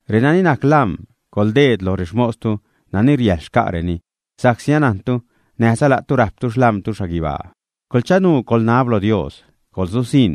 Renani najc lam̲, coḻdeed loj rexmostu nani riäjḻ xca'reni sa'csi anantu näjza la'tu rajptu xlam̲tu xhaguibaa. Coḻchanuu coḻnab lo Dios, coḻsusiṉ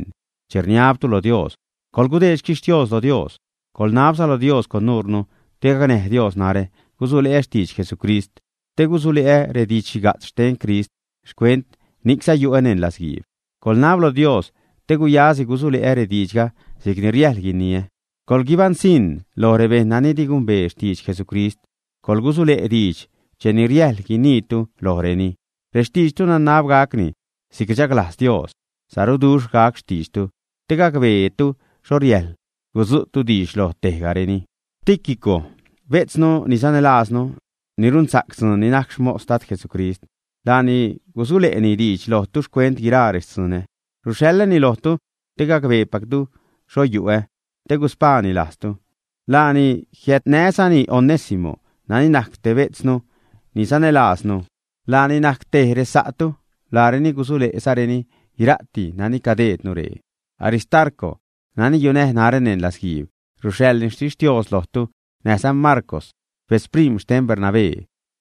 che rniabtu lo Dios. Coḻgudeed xquixtios lo Dios. Coḻnabza lo Dios con nuure te gacnäj Dios narä gusule'ä xtidx Jesucrist, te gusule'ä redidx-xhiga'tz xten Crist. Xcuent ni'cza yu'ä neṉ latzguiib. Coḻnab lo Dios te guyasi gusule'ä rediidxga si'cni riäjl guiniä. Coḻguibaṉsiṉ loj rebejṉ nani di gumbee xtidx Jesucrist, coḻgusule' diidx cheni riäjl guiniitu lojreni. Rextiidxtu nanab gacni si'c rchaglajz Dios, saruduxhza gac xtiidxtu te gacbeetu xho riäjl gudzu'tu diidx loj tejgareni. Tíquico, bejtznu ni sanälajznu, ni runsa'c dzuun, ni najc xmos Dad Jesucrist, laani gusule'ni diidx lojtu xcuent guiraa rextzunä. Ruxhaḻäni lojtu te gacbeepactu xho yu'ä, te guspaani lajztu. Laani jiädnäzani Onésimo nani najc te betznu ni sanälajznu. Laani najc tej resa'tu. Laareni gusule'zareni guira'ti nani cadeednu ree. Aristarco, nani yunäj narä neṉ latzguiib, ruxhaḻni xtixtios lojtu näjza Marcw, betz prim̲ xten Bernabé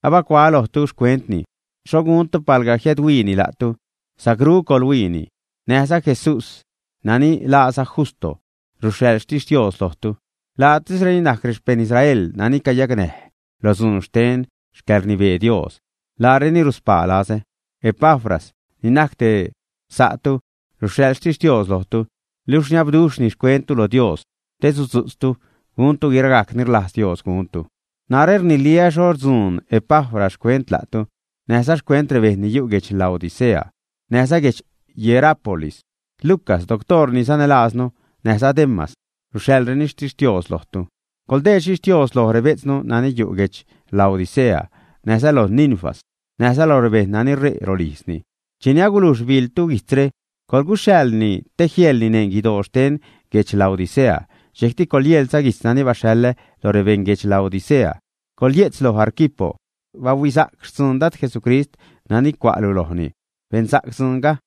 (abacuaä lojtu xcuentni, xho guntu, palga jiädhuiini la'tu, sacru coḻhuiini). Näjza Jesús nani laaza Justo, ruxhaḻ xtixtios lojtu. Laatisreni najc rexpejṉ Israel nani cayacnäj loj dzuun xten xcäḻrnibee Dios. Laareni ruspaa lazä. Epafras, ni najc te sa'tu, ruxhaḻ xtixtios lojtu, luxh rniabduxhni xcuenttu lo Dios te sudzu'tztu guntu guiragajc ni rlajz Dios guntu. Narä rniliä xho rdzuun Epafras xcuent la'tu, näjza xcuent rebejṉ ni yu' guedx Laodicea, näjza guedx Hierápolis. Lucas, doctoor ni sanälajznu, näjza Demas ruxhaḻzareni xtixtios lojtu. Coḻdeed xtixtios loj rebejtznu nani yu' guedx Laodicea, näjza loj Ninfas, näjza lo rebejṉ nani re' rolijzni. Cheni agulujx biḻtu guijtzre, coḻguxhaḻni te jieḻni neṉ guidoo xten guedx Laodicea, dxejcti coḻyeḻza guijtz nani baxhaḻä lo rebeṉ guedx Laodicea. Coḻye'tz loj Arquipo: “Bahuisa'c xtzuun Dad Jesucrist nani cua'lu lojni. Bensa'c dzuunga.”